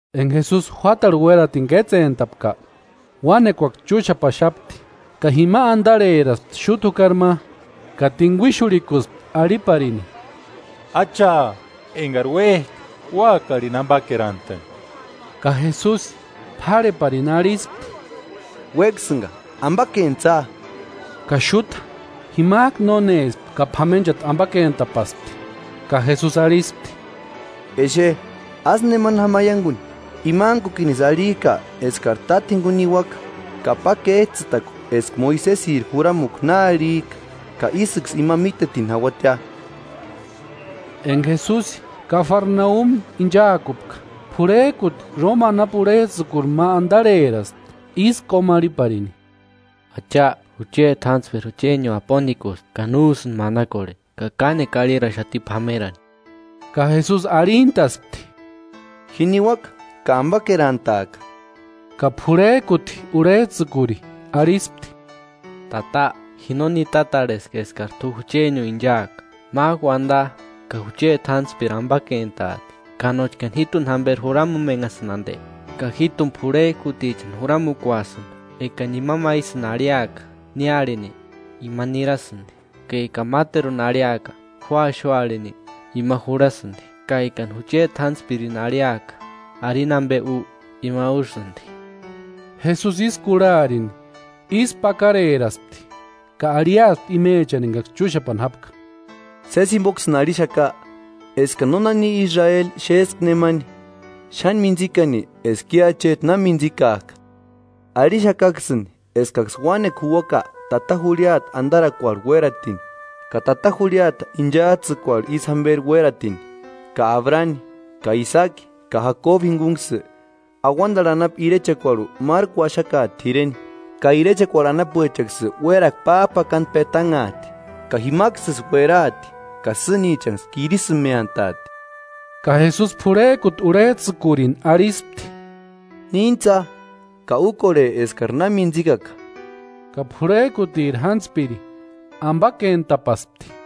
Enka Jesusi juátarhu uératini kétsentapka, uánekuaksï chúxapaxati. Ka jima antarheraspti xúta jukari ma ka tinkuixurhikuspti arhiparini: –Acha, enkari uék'a, úakarini ampakerantani. Ka Jesusi p'árheparini arhispti: –¡Uéksïnka, ampakentsïa! Ka xúta jimak'u nónespti ka p'amenchati ampakentapaspti. Ka Jesusi arhispti: –Exe, ásï nemani jáma aiankuni, imantkukinisï arhik'a eskari táta jinkuni niuaka ka pa kéts'ïtakua eska Moisesiri juramukua na arhik'a ka ísïksï ima mítetini jauatia. Enka Jesusi Kafarnaumi inchaakupka, p'urhek'uti Róma anapu urhets'ïkuri ma antarheraspti ísï kómarhiparini. –Acha, jucheti jántspiri juchenio apontikusti, ka no úsïnti manakorheni ka kánekua arhiraxati p'amerani. Ka Jesusi arhintaspti: –Ji niuaka ka ampakerantaaka. Ka p'urhek'uti urhets'ïkuri arhispti: –Tata, ji no nitatarheska eskari t'u juchenio inchaaka, mák'u uanta ka jucheti jántspiri ampakentaati. Ka nóchkani jít'uni jamperi juramumenhasïni anti, ka jít'uni p'urhek'utichani juramukuasïnka, ekani ima ma ísïni arhiaka: Ni arhini, ima nirasïnti, ka ekani máteruni arhiaka: Ju axu arhini, ima jurhasïnti, ka ekani jucheti jántspirini arhiaka: Arini ampe u, ima úsïnti. Jesusi ísï kurharini ísku pakareraspti ka arhiaspti imechani enkaksï chúxapani jápka: –Sési jimpoksïni arhixaka, eskani nónani Israeli xéska nemani, xáni mintsikani eska i acheti na mintsikak'a. Arhixakaksïni eskaksï uánekua juuaka tata jurhiata antarakuarhu uératini ka tata jurhiata inchats'ïkuarhu isï jamperi uératini, ka Abrani, ka Isaaki ka Jakobu jinkunksï, auantarhu anapu irechekuarhu márku uaxakaati t'ireni. Ka irechekuarhu anapuechaksï uérakua páp'akantu petanhaati; ka jimaksïsï ueraati ka sïnichanksï kirisïmeantaati. Ka Jesusi p'urhek'uti urhets'ïkurini arhispti: –Níntsa ka úkorhe eskari na mintsikaka. Ka p'urhek'utiri jántspiri ampakentapaspti.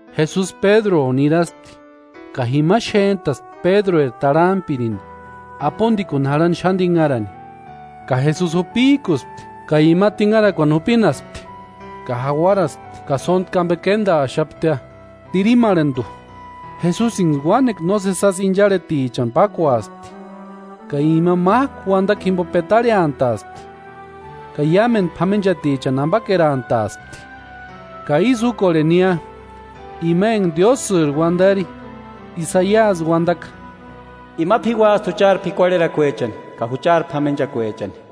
Jesusi Pédruo niraspti ka jima xént'aspti Pédrueri tarhampirini apontikuni jarhani xáni tinharani. Ka Jesusi jupik'uspti ka ima tinharakuani jupinaspti ka jauaraspti ka sóntku ampe k'éntaaxaptia. Tirimarhantu, Jesusinksï uánekua nósesi jásï incharhetichani pákuaspti ka ima mák'u uantakua jimpo petarheantaaspti, ka iámentu p'amenchatichani ampakerantaaspti, ka ísï úkorhenia ima enka Diósïri uantari Isaiasi uantaka; “Ima p'iuasti juchari p'ikuarherakuechani ka juchari p'amenchakuechani.”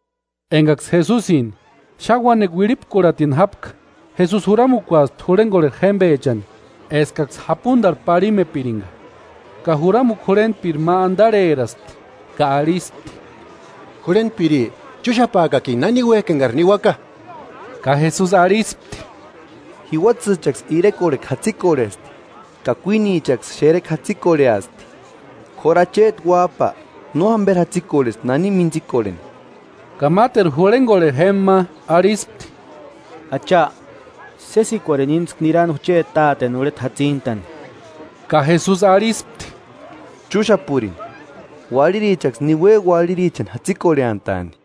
Enkaksï Jesusini xáni uánekua uirhipkurhatini jápka, Jesusi juramukuaspti jurhenkorheri jémpechani eskaksï japuntarhu parhimepirinka. Ka juramukua jurhentpiri ma antarheraspti ka arhispti: –Jurhentpiri, chúxapaakakini nani uék'i enkari niuaka. Ka Jesusi arhispti: –Jiuatsïchaksï irekorhekua jatsikorhesti ka kuínichaksï xerekua jatsikorheasti, k'óru Acheti Uáp'a no jamperi jatsikorhesti nani mintsikorheni. Ka máteru jurhenkorheri jémpa ma arhispti: –Acha, sésikuarini íntsku nirani jucheti táteni urheta jatsintani. Ka Jesusi arhispti: –Chúxapurini, uarhirichaksï niue uarhirichani jatsikorheantaani.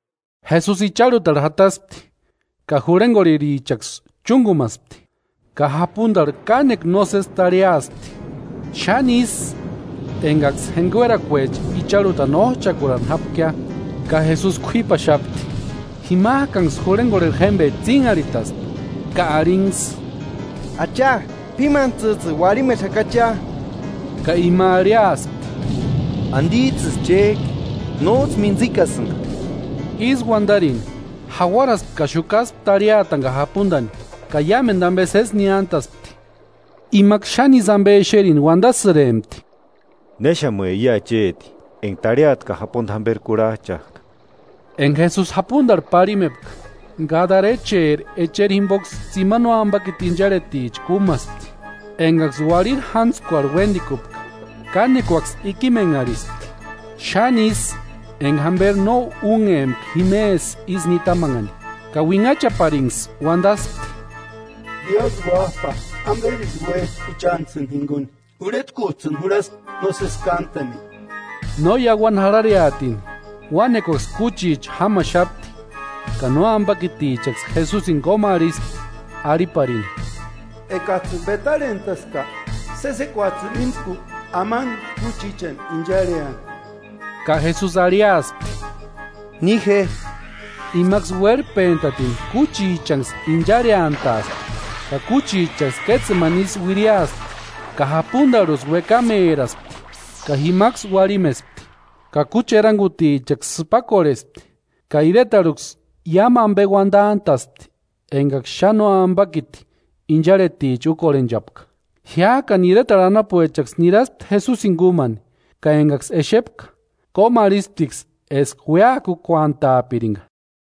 Jesusi icharhutarhu jataspti ka jurhenkorherichaksï chúnkumaspti. Ka japuntarhu kánekua nósesi tarhiaspti, xáni ísï enkaksï jenkuerakuecha icharhutani óch'akurani jápkia. Ka Jesusi k'uípaxapti. Jimak'anksï jurhenkorheri jémpecha tsínharhitaspti ka arhinksï: –¡Acha, p'ímantsïts'ïni, uarhimexakachia! Ka ima arhiaspti: –¿Antits'ïsï chék'i? ¡Nóts'ï mintsikasïnka! Ísï uantarini, jauaraspti ka xukaspti tarhiatani ka japuntani ka iámentu ampe sési niántaspti. Imaksï xáni ísï ampe exerini uantasïrempti: –¿Néxamue i acheti enka tarhiata ka japunta jamperi kurhach'ak'a? Enka Jesusi japuntarhu parhimepka, Gadarecheri echeri jimpoksï tsimani nóampakiti incharheticha kúmaspti, enkaksï uarhiri jántskuarhu uéntikupka. Kánekuaksï ikimenharhispti, xáni ísï enka jamperi no únhempka jimesï isï nitamanhani. Ka uinhachaparinksï uantaspti: –Diósï Uáp'a ¿Amperisï úek'i juchantsïni jinkuni? ¿Urhetkuts'ïni jurhaski nósesi kántani? No iauani jarhareatini uánekuaksï kúchicha jámaxapti, ka nóampakitichaksï Jesusini kómarhispti, arhiparini: –Ekats'ïni petarhentaska, sésikuats'ïni íntsku amani kúchichani incharheani. Ka Jesusi arhiaspti: –Ni je. Imaksï uérhpentatini kúchichanksï incharheantaaspti ka kúchichaksï kétsemani isï uiriaspti ka japuntarhuksï uékameraspti ka jimaksï uarhimespti. Ka kúchi erankutichaksï sïpakorhespti ka iretarhuksï iámu ampe uantant'a'spti enkaksï xáni nóampakiti incharheticha úkorhenchapka. Jiák'ani iretarhu anapuechaksï niraspti Jesusini kúmani, ka enkaksï exepka kómarhisptiksï eska uéakukuantaapirinka.